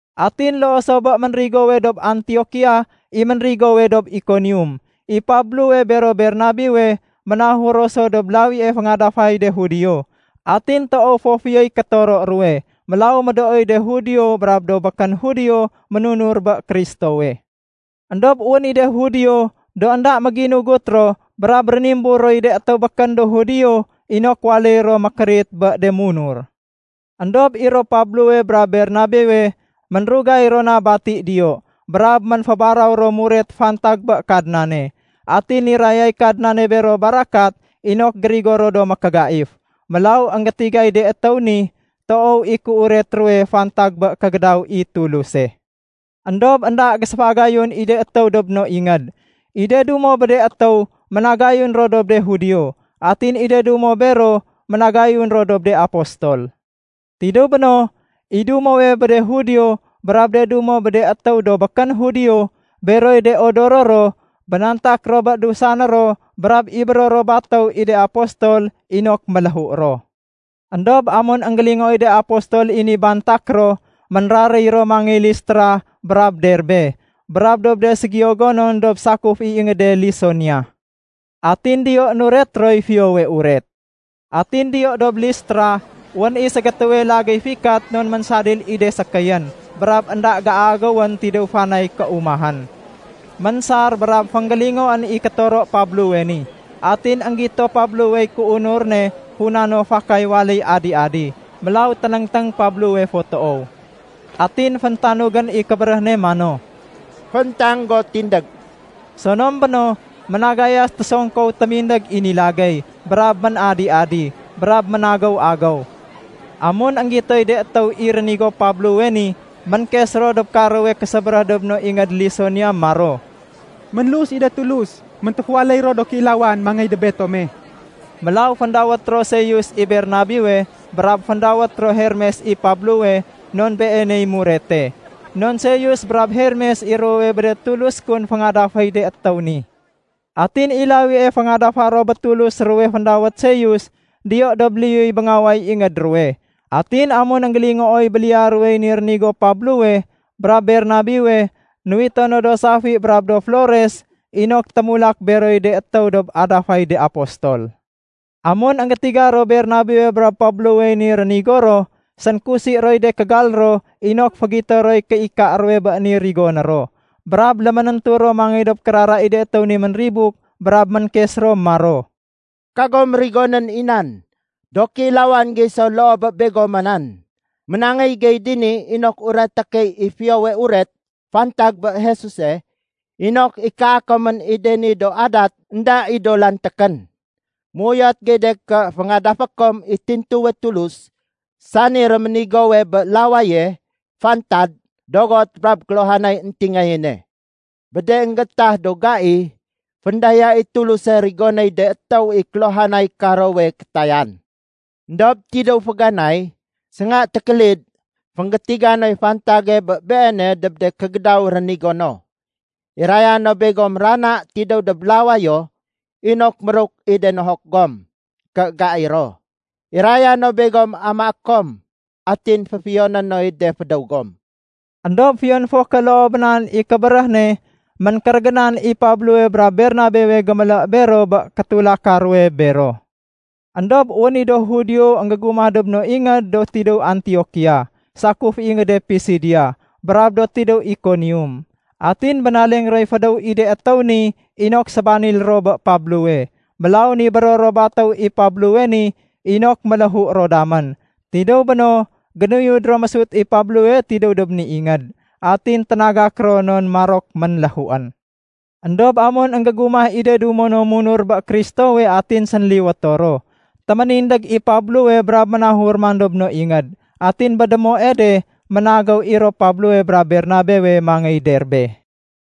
Atin loo so bé ménrigowe dob Antiokia, i ménrigowe dob Ikonium. I Pablowe bero Bernabewe ménahur ro so dob lawie féngadafay de Judio. Atin toow fo fiyoy kétoro ruwe, mélaw médooy de Judio brab do békén Judio ménunur bé Kristowe. Endob wén i de Judio do énda méginugut ro brab rénimbur roy de étéw békén do Judio inok waléy ro mékérit bé de munur. Endob i ro Pablowe brab Bernabewe, ménrugay ro na ménbati diyo. Brab ménfébaraw ro muret fantag bé Kadnane. Atin nirayay Kadnane bero barakat inok gérigo ro do mékégaif. Mélaw énggétigay de étéw ni, toow i kéuret ruwe fantag bé kégédaw i Tuluse. Endob énda géséfagayun i de étéw dob no ingéd. I de dumo bé de étéw ménagayun ro dob de Judio. Atin i de dumo bero ménagayun ro dob de apostol. Tidéw béno, i dumo bé de Judio brab de dumo bé de étéw do békén Judio, beroy de odoro ro, bénantak ro bé dusané ro brab ibéro ro batéw i de apostol inok méléhu ro. Endob amun énggélingooy de apostol i ni bantak ro, ménraréy ro mangéy Listra brab Derbe, brab dob de ségiyo gonon dob sakuf i ingéde Lisonia. Atin diyo nuret roy Fiyowe Uret. Atin diyo dob Listra, wén i ségétéwe lagéy fikat non ménsadil i de sékéyén brab énda géagéwén tidéw fanay kéumahén. Ménsar brab fénggélingoén i kétoro Pablowe ni. Atin énggito Pablowey kéunur ne funa no fakay waléy adi-adi. Mélaw ténéngténg Pablowe fo toow. Atin féntanugén i kébéréh ne mano, “Fééntang go tindég.” Sonom béno, ménagayas tésongkow témindég i ni lagéy brab ménadi-adi, brab ménagéw-agéw. Amun énggitoy de étéw i rénigo Pablowe ni, ménkes ro dob karowe késébéréh dob no ingéd Lisonia maro, “Ménlus i de tulus méntéfuwaléy ro do kéilawan mangéy dob betome!” Mélaw féndawét ro Seus i Bernabewe brab féndawét ro Hermes i Pablowe non beeney murete. Non Seus brab Hermes i ruwowe bé de tulus kun féngadaféy de étéw ni. Atin i lawie féngadafa ro bé tulus ruwe féndawét Seus, diyo dob liyuy béngaway ingéd ruwe. Atin amun énggélingooy béliya ruwey ni rénigo Pablowe brab Bernabewe, nuwito no do safi brab do flores inok témulak beroy de étéw dob adafay de apostol. Amun énggétiga ro Bernabewe brab Pablowey ni rénigo ro, sénkusi roy de kégal ro inok fégito roy kéika ruwe bé ni rigoné ro. Brab léménéntu ro mangéy dob kérara i de étéw ni ménribuk brab ménkes ro maro, “Kagom rigonén i nan! Do kéilawan gey so loo bé begoma nan. Ménangéy gey dini inok ureté key i Fiyowe Uret fantag bé Jesuse inok ikaa komén i de ni do adat énda i do lantékén. Méuyot gey de ké féngadafé kom i tintuwe Tulus sani réménigowe bé lawaye, fantad, dogot, brab kéluhanay éntingayéne. Bé de énggétah do gai, féndaya i Tuluse rigonéy de étéw i kéluhanay karowe kétayan. Endob tidéw féganay, sénga tékélid fénggétiga noy fantage bé Beene dob de kégédaw rénigo no. Iraya no begom rana tidéw dob lawayo inok méruk i de nohok gom ké gai ro. Iraya no begom amaé kom atin féfiyoné noy de fédéw gom.” Endob fiyon fo ké loo bé nan i kébéréh ne, ménkérégénan i Pablowe brab Bernabewe gémélé bero bé kétulaka ruwe bero. Endob wén i do Judio énggégumah dob no ingéd do tidéw Antiokia sakuf i ingéde Pisidia brab do tidéw Ikonium. Atin bénaleng roy fédéw i de étéw ni inok sébanil ro bé Pablowe. Mélaw nibéro ro batéw i Pablowe ni inok méléhu ro damén. Tidéw béno, génuyud ro mésut i Pablowe tidéw dob ni ingéd, atin ténagak ro non marok ménléhuén. Endob amun énggégumah i de dumo no munur bé Kristowe atin sénliwéto ro, téménindég i Pablowe brab ménahur man dob no ingéd. Atin bé démoe de ménagéw i ro Pablowe brab Bernabewe mangéy Derbe.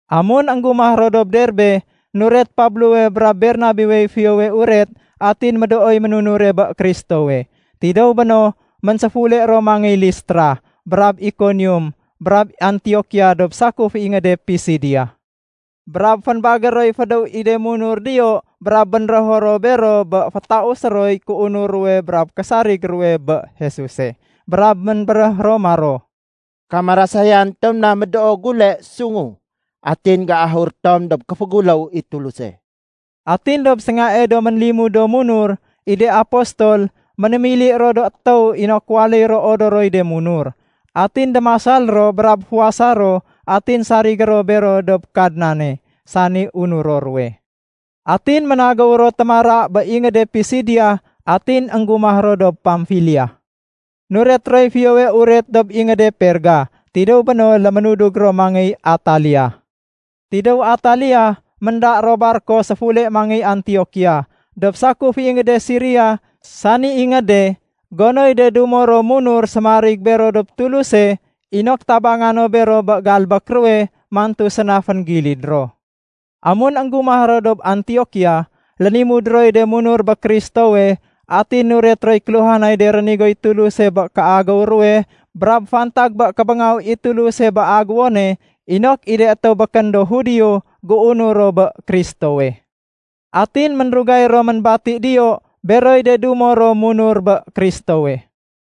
Amun énggumah ro dob Derbe, nuret Pablowe brab Bernabewey Fiyowe Uret atin médooy ménunure bé Kristowe. Tidéw béno, ménséfule ro mangéy Listra brab Ikonium brab Antiokia dob sakuf i ingéde Pisidia. Brab fénbagér roy fédéw i de munur diyo brab bénrého ro bero bé fétausé roy kéodor ruwe brab késarig ruwe bé Jesuse. Brab ménbéréh ro maro, “Kamarasayan tom na médoo gule sungu atin géahur tom dob kéféguléw i Tuluse.” Atin dob séngae do ménlimud do munur, i de apostol, ménémili ro do étéw inok waléy ro odoroy de munur. Atin démasal ro brab fuwasa ro atin sarigé ro bero dob Kadnane, sani unuro ruwe. Atin ménagéw ro témara bé ingéde Pisidia atin énggumah ro dob Pamfilia. Nuret roy Fiyowe Uret dob ingéde Perga. Tidéw béno léménudug ro mangéy Atalia. Tidéw Atalia, ménda ro barko séfule mangéy Antiokia, dob sakuf i ingéde Siria sani ingéde gonoy de dumo ro munur séménarig bero dob Tuluse inok tabanga no bero bé galbék ruwe mantu séna fénggilid ro. Amun énggumah ro dob Antiokia, lénimud roy de munur bé Kristowe atin nuret roy kéluhanay de rénigoy Tuluse bé kéagéw ruwe brab fantag bé kébéngaw i Tuluse bé agéwone inok i de étéw békén do Judio géunur ro bé Kristowe. Atin ménrugay ro ménbati diyo beroy de dumo ro munur bé Kristowe.